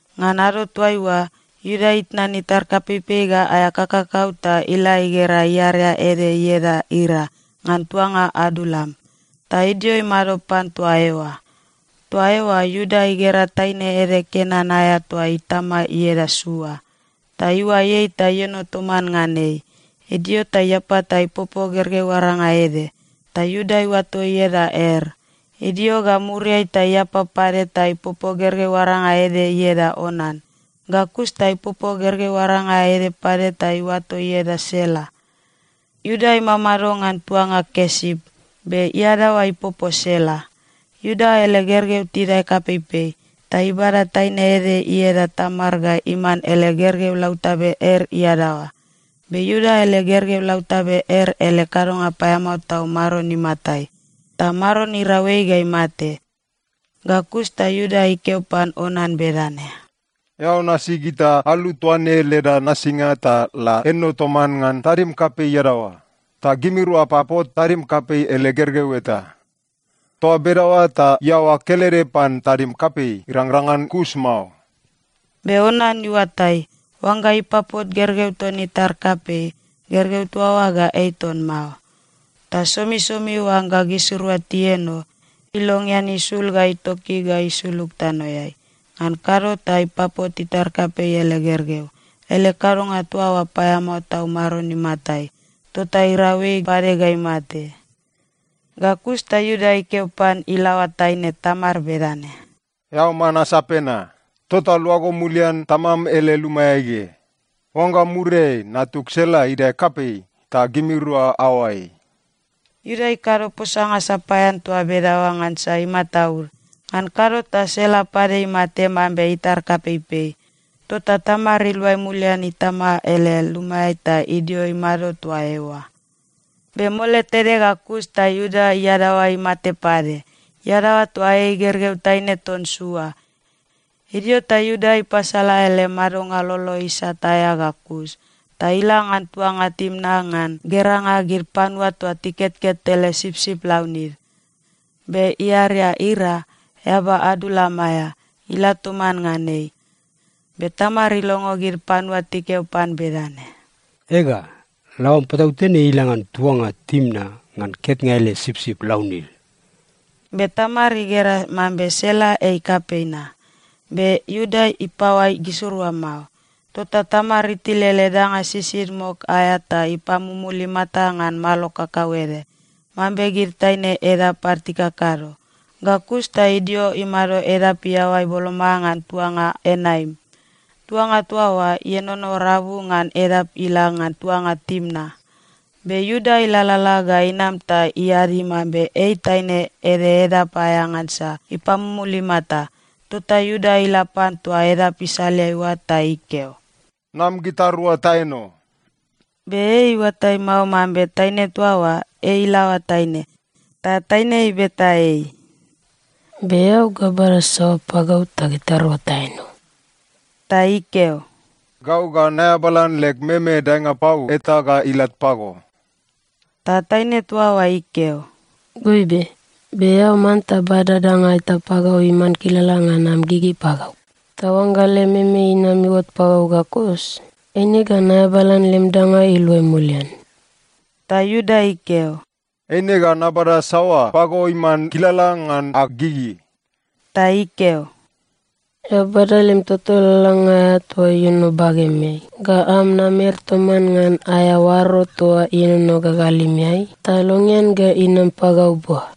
Ngan ado toaiua, Iuda itnan itar kapeipei ga aea kakakau ta ila igera iarea ede ieda Ira ngan tuanga Adulam, ta idio imado pan toa eoa. Toa eoa Iuda igera taine ede Kenan aea toa itama ieda Sua. Ta iuai ei ta ieno toman ngan ei. Idio ta iapa ta ipopo gergeu aranga ede. Ta Iuda iuato ieda Er. Idio ga muriai ta iapa pade ta ipopo gergeu aranga ede ieda Onan. Ga kus ta ipopo gergeu aranga ede pade ta iuato ieda Sela. Iuda imamado ngan tuanga Kesip, be iadaoa ipopo Sela. Iuda ele gergeu tidae kapeipei, ta ibada taine ede ieda Tamar ga iman ele gergeu lautabe Er iadaoa. Be Iuda ele gergeu lautabe Er ele kadonga paeamao tau Maron imatai, ta Maron irau ei ga imate. Ga kus ta Iuda ikeo pan Onan bedane, “Eao nasi gita alu toa ne leda nasinga ta la eno toman ngan tadim kapei iadaoa, ta gimirua apapot tadim kapei ele gergeu eta. Toa bedaoa ta iaoa kelede pan tadim kapei irangrang ngan kus mao.” Be Onan iuatai, oangga ipapot gergeu ton itar kapei, gergeu toa oa ga ei ton mao. Ta somisomi oangga gisirua tieno, ilongean isul ga itoki ga isulug tanoeai. Ngan kado ta ipapot itar kapei ele gergeu. Ele kadonga toa oa paeamao tau Maron imatai. Tota irau ei pade ga imate. Ga kus ta Iuda ikeo pan ilaoa taine Tamar bedane, “Eao man asape na. Tota luago mulian tamam ele lumaeai ge. Oangga muriai, natug Sela idae kapei, ta gimirua aoai.” Iuda ikado posanga sapaean toa bedaoa ngansa imataud. Ngan kado ta Sela pade imate mambe itar kapeipei. Tota Tamar iluai mulian itama ele lumaeai ta idio imado toa eoa. Be mole tede ga kus ta Iuda iadaoa imate pade. (Iadaoa toa ei gergeu taine ton Sua.) Idio ta Iuda ipasala ele madonga lolo isat aea ga kus, ta ila ngan tuanga Timna ngan geranga gid panua toa tiketket ele sipsip launid. Be iarea Ira, eaba Adulam aea, ila toman ngan ei. Be Tamar ilongo gid panua tikeo pan bedane, “Ega, laoam patautene ila ngan tuanga Timna ngan ketnga ele sipsip launid.” Be Tamar igera mambe Sela ei kapei na, be Iuda ipaoai gisirua mao. Tota Tamar itil ele danga sisid mok aea ta ipamumul imata ngan malo kakauede, mambe gid taine edap ad tikakado. Ga kus ta idio imado edap iaoai boloma ngan tuanga Enaim. Tuanga toa oa ienono rabu ngan edap ila ngan tuanga Timna. Be Iuda ilalala ga inam ta iadi mambe ei taine ede edap aea ngansa ipamumul imata. Tota Iuda ila pan toa edap isaleai oa, ta ikeo, “Nam gitarua taeno.” Be ei iuatai mao mambe taine toa oa, ei ilaoa taine. Ta taine ibeta ei, “Be eao ga bada saoa pagau ta gitarua taeno.” Ta ikeo, “Gau ga naeabalan leg meme daenga pau eta ga ilat pago.” Ta taine toa oa ikeo, “Goibe, be eao manta bada danga eta pagau iman kilala ngan am gigi pagau, ta oangga lem meme inam iuot pagau ga kus, eine ga naeabalan lem danga iluai mulian.” Ta Iuda ikeo, “Eine ga nabada saoa pago iman kilala ngan ag gigi?” Ta ikeo, “Eao bada lem toto lalalanga aea toa ienono bagemeai ga am namer toman ngan aea oaro toa ienono gagalimeai, ta longean ga inam pagau bua.”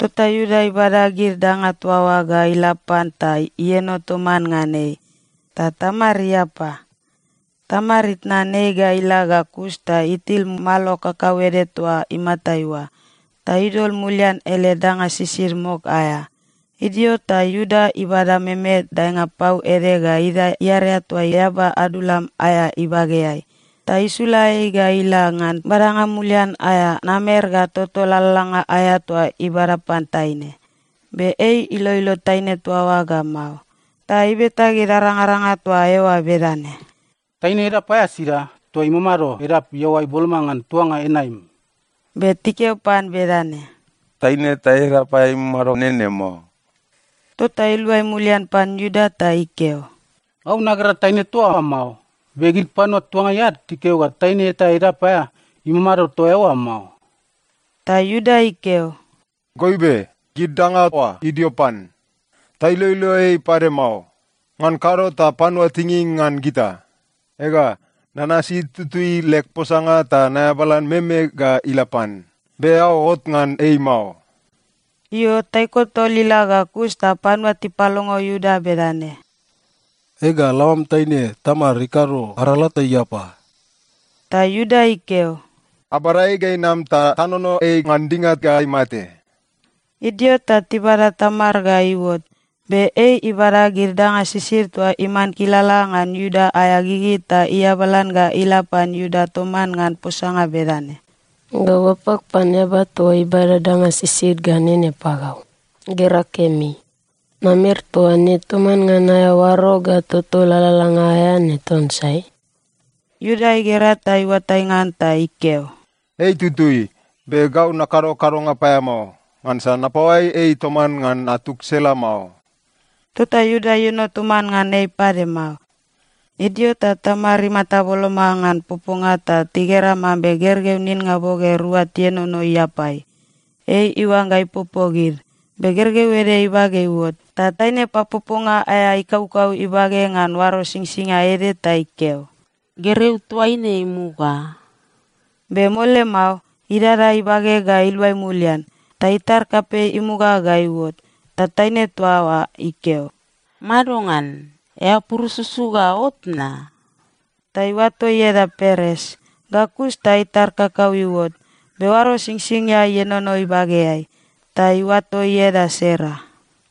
Tota Iuda ibada gid danga toa oa ga ila pan ta ieno toman ngan ei. Ta Tamar iapa. Tamar itnan ei ga ila ga kus ta itil malo kakauede toa imatai oa, ta idol mulian ele danga sisid mok aea. Idio ta Iuda ibada meme daenga pau ede ga idae iarea toa eaba Adulam aea ibageai, ta isula ei ga ila ngan badanga mulian aea namer ga toto lalalanga aea toa ibada pan taine. Be ei iloilo taine toa oa ga mao. Ta ibeta gid arangaranga toa eoa bedane, “Taine edap aea sida, toa imamado edap iaoai boloma ngan tuanga Enaim?” Be tikeo pan bedane, “Taine eta edap aea imamado nene mao.” Tota iluai mulian pan Iuda ta ikeo, “Gau nagera taine toa oa mao, be gid panua tuangai ad tikeo ga taine eta edap aea imamado toa eoa mao.” Ta Iuda ikeo, “Goibe, gid danga oa idio pan. Tailoilo ei pade mao. Ngan kado ta panua tinging ngan gita. Ega, nanasi tutui leg posanga ta naeabalan meme ga ila pan, be eao ot ngan ei mao.” Io, taiko tol ila ga kus ta panua tipalongo Iuda bedane, “Ega, laoam taine Tamar ikado arala ta iapa.” Ta Iuda ikeo, “Abada ei ga inam ta tanono ei ngan dinga ga imate.” Idio ta tibada Tamar ga iuot, be ei ibada gid danga sisid toa iman kilala ngan Iuda aea gigi ta iabalan ga ila pan Iuda toman ngan posanga bedane, “Gau apag pan eaba toa ibada danga sisid ga nene pagau. Gera kemi. Namer toa ne toman ngan aea oaro ga toto lalalanga aea ne ton sai?” Iuda igera ta iuatai ngan ta ikeo, “Ei itutui. Be gau nakado kadonga paeamao, ngansa napaoai ei toman ngan natug Sela mao.” Tota Iuda ieno toman ngan ei pade mao. Idio ta Tamar imata boloma ngan poponga ta tigera mambe gergeu ninnga boge rua tienono iapai. Ei iuangga ipopo gid, be gergeu ede ibage iuot, ta taine papoponga aea ikaukau ibage ngan oaro singsingia ede ta ikeo, “Gergeu toa ne imuga.” Be mole mao, idada ibage ga iluai mulian, ta itar kapei imuga ga iuot. Ta taine toa oa ikeo, “Madongan? Eao purususu ga ot na?” Ta iuato ieda Peres. Ga kus ta itar kakau iuot, be oaro singsingia ienono ibageai. Ta iuato ieda Sera.